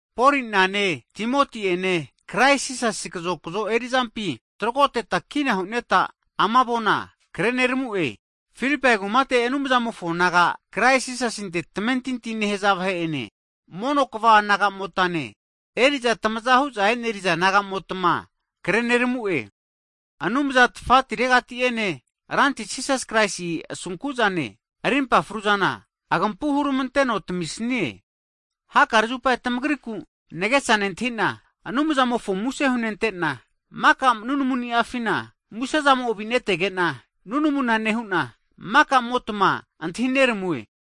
Poli'nane, Timoti'ene Krais Jisasi kazokzo eri'zampi tragoteta kina hu'neta, Filipai kumate Anumzamofo naga Krais Jisasinte tamentinti nehaza vahe'ene mono kva nagamotane, eri'za tamaza hu'za eneriza naga'motma kre neramu'e. Anumza nafatimo'ene Ranti Jisas Kraisi enena asuragiramanteno, rimpa fruzana agampu hurmanteno tamisie. Hakare zupa tamagriku nagesa nentahi'na Anumzamofo muse hunentena, maka nunamunia'fina musezamo avi'netege'na nunamu nehu'na maka'motma antahi neramue.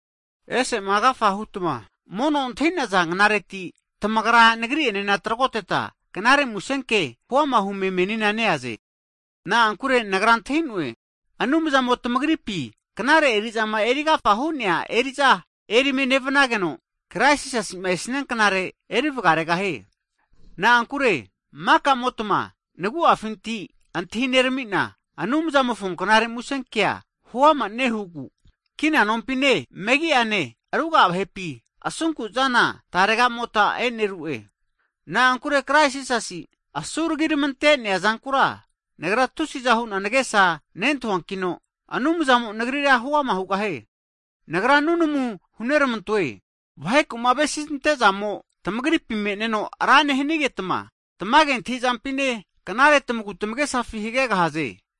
Ese'ma agafa hutma mono antahi'naza knareti tamagra nagri'ene tragoteta knare musenke huama hume menina neaze. Na'ankure nagra antahi'noe, Anumzamo tamagripi knare eri'zama erigafa hu'nea eri'za erime nevnageno, Krais Jisasi esnia knare eri vgaregahie. Na'ankure maka'motma nagu'areti antahi nerami'na, Anumzamofo knare musenkea huama nehugu kina nompine, megi'ane ruga'a vahepi, asunku'zana tarega'mota e'neru'e. Na'ankure Krais Jisasi asuragirmantea zankura, nagra tusi'za hu'na nagesa nentahuankino, Anumzamo nagrira huama hugahie. Nagra nunamuna huneramantoe, vaheku'ma avesizamante'zamo tamagripi me'neno ra nehnigetma, tamage antahi'zampine, knare tamagu tamagesafi hagegahaze.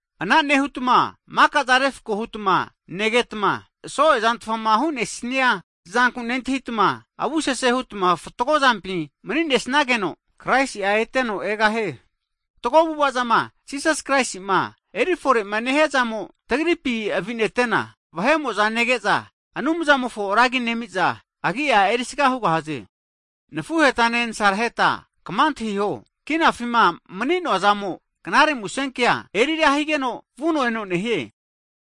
Ana nehutma maka'zana refko hutma negetma, so'e zantfama hu'nesnia zanku nentahitma, avusese hutma fatgo zampi mani'nesnageno Kraisi'a eteno egahie. Fatgo avu'ava'zama Jisas Kraisima eri fore'ma nehiazamo tagripi avinete'na, vahe'mo'za nege'za Anumzamofona ra agi nemiza, agi'a erisaga hugahaze. Nafuhetane nasaraheta kma antahiho, kinafima mani'noa zamo knare musenkea (gospol) eri ra higeno vuno eno nehie.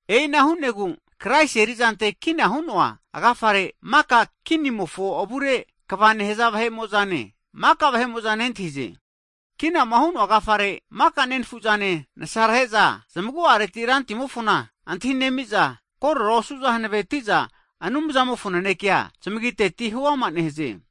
E'ina hu'negu, Kraisi eri'zante kina hu'noa agafare, maka kinimofo avufare kva nehaza vahe'mo'zane, maka vahe'mo'za nentahize. Kinama hu'noa agafare maka nenfu'zane nasarhe'zane zamagu'areti Rantimofona antahi nemi'za, korora osu'za hanaveti'za Anumzamofo nanekea zamagiteti huama nehaze.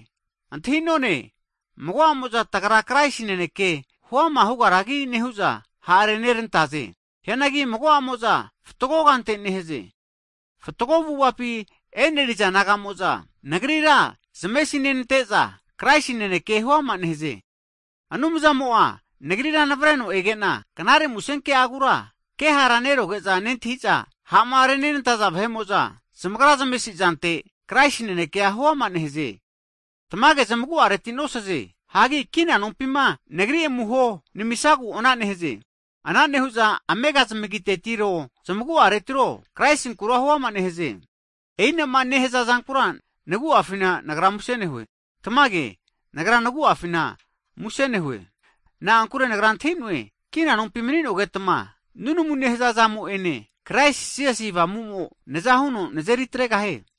Antahi'none, mago'amo'za hu'za tagra Kraisi naneke huama hugaragi nehu'za, ha' renenantaze. Hianagi mago'amo'za fatgo kante nehaze. Fatgo avu'avapi e'neriza naga'mo'za, nagrira zamesi nenante'za Kraisi naneke huama nehaze. Anumzamo'a nagrira navreno ege'na, Knare MusenKe'agura kehara neroge'za nentahiza, ha'ma renenantaza vahe'mo'za zamagra zamesi'zante Kraisi nanekea huama nehaze. Tamage zamagu'areti nosaze, hagi kina nompima nagri amuho namisagu ana nehaze. Ana nehu'za amega zamagitetiro zamaguaretiro Kraisinkura huama nehaze. E'inama nehaza zankura nagra nagu'a muse nehue. Tamage, naguafina nagra muse nehue. Na'ankure nagra antahi'noe, kina nompi mani'nogetma, nunamu nehaza zamo'ene, Jisasi Kraisi Avamu'mo naza huno nazeri atregahie.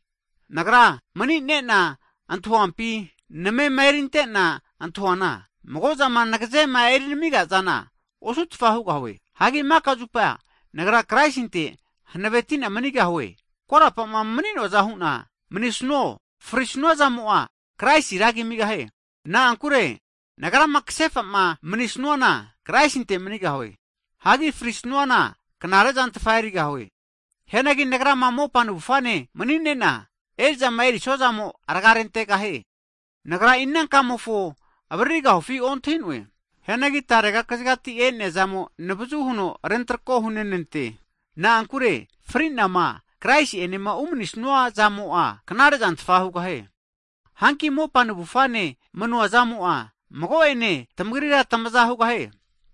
Nagra mani'ne'na antahuampi, namema eritena antahuana, mago'zama nagazema erinami'zana osutfa hugahue. Hagi mika zupa nagra Kraisinte hanaveti'na manigahue, korapa'ma mani'noaza hu'na manisnuo, frisnua zamo'a, Kraisi ragi amigahie. Na'ankure nagrama ksefa'ma manisnuana Kraisinte manigahue. Hagi frisnuana knare'zantfa erigahue. Hianagi nagrama mopa navufane mani'ne'na, eri'zama erisua zamo rga rentegahie. Nagra ina kamofo avaririgahufi ontahi'noe. Hianagi tarega kazigati e'nea zamo navazu huno rentrako hu'nenante, na'ankure fri'nama Kraisi'ene umani'snua zamo'a knare zantfa hugahie. Hanki mopa navufane mani'nua zamo'a mago'ene tamagri tmaza hugahie.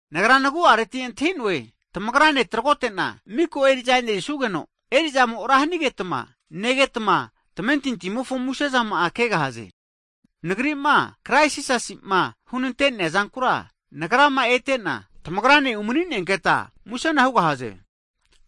Nagra nagu'areti antahi'noe, tamagrane tragote'na miko eri'za e'nerisugeno, eri'zamo ra hanigetma negetma, tamentintimofo muse'zama'a kegahaze. Nagri'ma Kraisi Jisasi'ma hunante'nea zankura nagrama ete'na tamagrane umani'nenketa, musena hugahaze.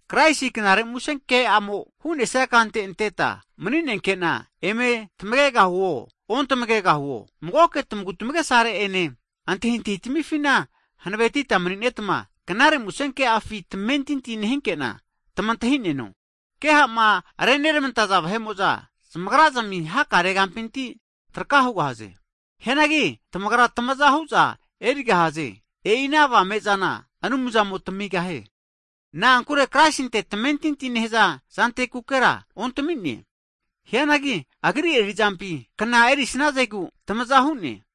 Kraisi knare musenke'amo hu'nesia kante anteta mani'nenke'na eme tamagegahuo, ontamagegahuo, magoke tamagu tamagesare ene antahintahi tmifina hanavetitma mani'netma, Knare MusenKe'afi tamentintia nehinke'na tmantahi'neno. Keha'ma renermantaza vahe'mo'za, zamagra'zmi hakare kampinti traka hugahaze. Hianagi tamagra tmazahu'za erigahaze. E'i ana avame zana Anumzamo tamigahie. Na'ankure Kraisinte tamentinti nehaza zantekukera ontami'ne, hianagi Agri eri'zampi kna erisnazegu, tamaza hu'ne.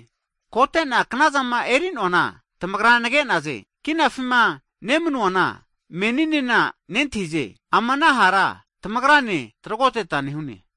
Kote'na knazama eri'noana tamagra nage'naze, knafima nemanuana meninena nentahize, ama ana hara tamagrane tragoteta nehune.